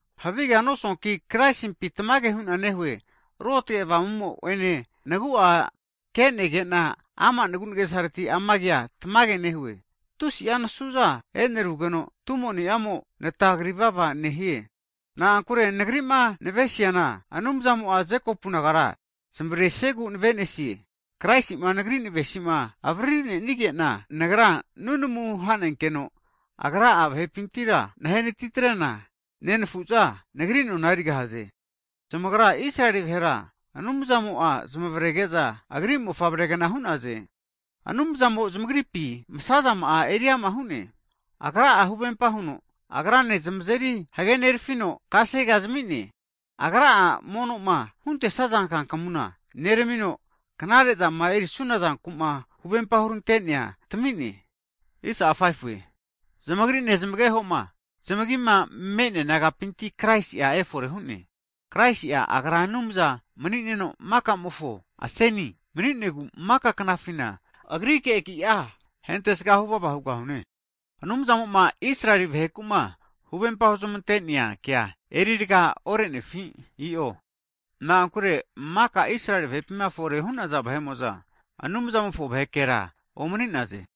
Havigea nosuanki, Kraisimpi tamage hu'na nehue. Ruotage Avamumo ene nagu'a kenegena ama' nagunagesareti ama kea tamage nehue. Tusi'a nasuza enerugeno, tumo niamo'a nata krivava nehie. Na'ankure, nagrima navesiana Anumzamo'a Jekopu nagara zmavresiegu navenesie, Kraisima nagri navesima avaririnigena, nagra nunamuna hanenkeno Agra'a vahepintira nahe natitrena, nenafu'za nagri nona erigahaze. Zamagra Israeli vahera Anumzamo'a zamavrege'za Agri mofavregna hu'naze. Anumzamo zamagripi masazama'a eri ama hu'ne. Agra'a huvempa huno, Agrane zamazeri hagenerefino kasege'a zamine. Agra'a monoma huntesaza kankmuna neramino, knare zama erisuna zanku'ma huvempa hurantenea tamine. Zamagri nezmagehoma zmagima me'nea nagapinti Kraisi'a efore hu'ne. Kraisi'a, Agra Anumza mni'neno makazamofo aseni mni'negu maka knafina, Agrike agi'a hentesga huvava hugahune! Tamage. Anumzamo'ma Israeli vaheku'ma huvempa huzamante'nea kea eri raga orenefi? I'o, na'ankure makama Israeli vahepima fore hu'naza vahe'mo'za Anumzamofo vahekera omani'naze!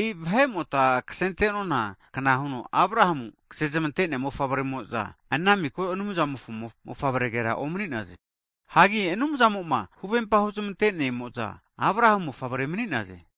E'i vahe'mota kasenentona kna huno Abrahamu ksezmante'nea mofavremo'za, ana miko Anumzamofo mofavregera omni'naze. Hagi Anumzamoma huvempama huzmante'nemo'za, Abrahamu mofavrea mni'naze.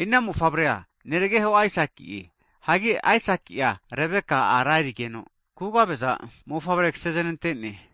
E'i ana mofavrea nerageho Aisakie. Hagi Aisaki'a, Rebeka ara erigeno, kugave'za mofavre kaseznantene.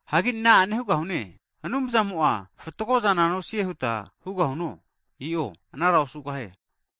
Hagi na'ane hugahune? Anumzamo'a fatgozana nosie huta hugahuno? I'o anara osugahie!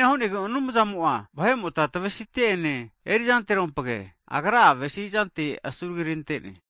E'ina hu'negu Anumzamo'a vahe'mota tavesite'ene erizanterompge, Agra'a avesizante asuragirante'ne.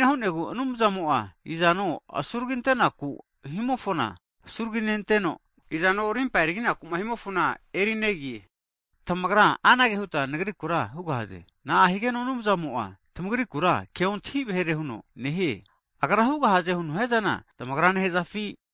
E'ina hu'negu Anumzamo'a izano asuraginte'naku himofona asuraginenteno, izano rimpama eriginakuma himofona erinegie. Tamagra anage huta nagrikura hugahaze. Na'a higeno Anumzamo'a tamagrikura keontahi vahere huno nehie? Agra hugahaze huno hiazana tamagra nehazafi?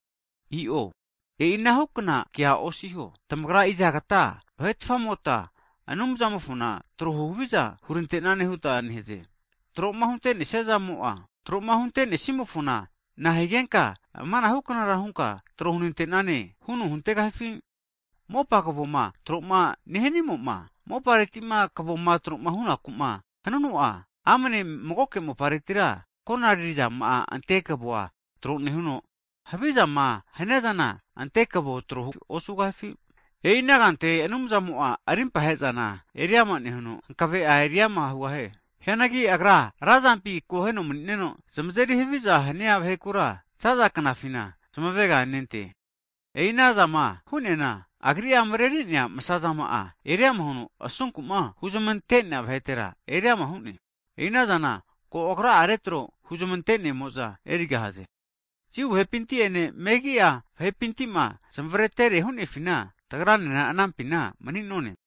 I'o, e'i anahukna kea osiho. Tamagra izagata, vahetafamota Anumzamofona tro huhaviza hurantenane huta nehaze? Tro'ma huntenesia zamo'a, tro'ma huntenesimofona, nahigenka amanahuknara hunka trohunantenane huno huntegahifi? Mopa kvoma tro nehanimo'ma, moparetima kvoma tromahunaku'ma hanuno'a, amane magoke moparetira konariri zama ante kvoa tro nehuno, havizama haniazana ante kavo tro osugahifi? E'i ana kanteke Anumzamo'a, rimpahezana eriama nehuno, hankave'a eriama hugahie. Hianagi Agra ra zampi akoheno mni'neno zmazeri haviza hania vahekura zaza knafina zmaveganente. E'i ana zama hu'neana, Agri'a mrerinea masa'zama eriama huno asunku'ma huzmantenea vahetera eriama hu'ne. E'i anazana ko Agra'a retro huzmante'nemo'za erigahaze. Jiu vahepinti'ene, megi'a vahepintima zmavaretere hunefina, tagranena anampina mani'none.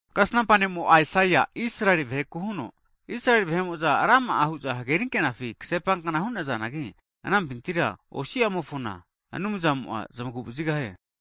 Kasnampa ne'mo Aisaia Israeli vaheku huno, Israeli vahe'mo'za rama'a hu'za hagerinkenafi kasepankna hu'nazanagi anampinti osi'amokizmi Anumzamo'a zmaguvazigahie.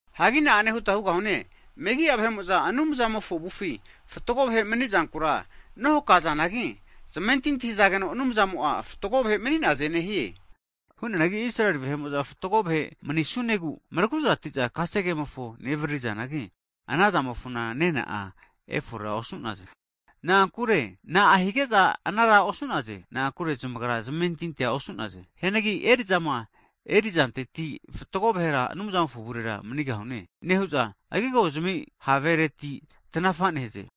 Hagi na'ane huta hugahune? Megi'a vahe'mo'za Anumzamofo avufi fatgo vahe mani'zankura nohakazanagi, zamentinti hzageno Anumzamo'a fatgo vahe mani'naze nehie. Hu'neanagi Israeli vahe'mo'za fatgo vahe manisunegu mraguzatiza kasegemofo nevaririzanagi, ana zamofona nena'a eriforera osu'naze. Na'a hige'za anara osu'naze? Na'ankure zmagra zmentintia osu'naze. Hianagi eri'zama erisazazanteti fatgo vahera Anumzamofo avurera manigahune nehu'za, agigozmi havereti tanafa nehaze.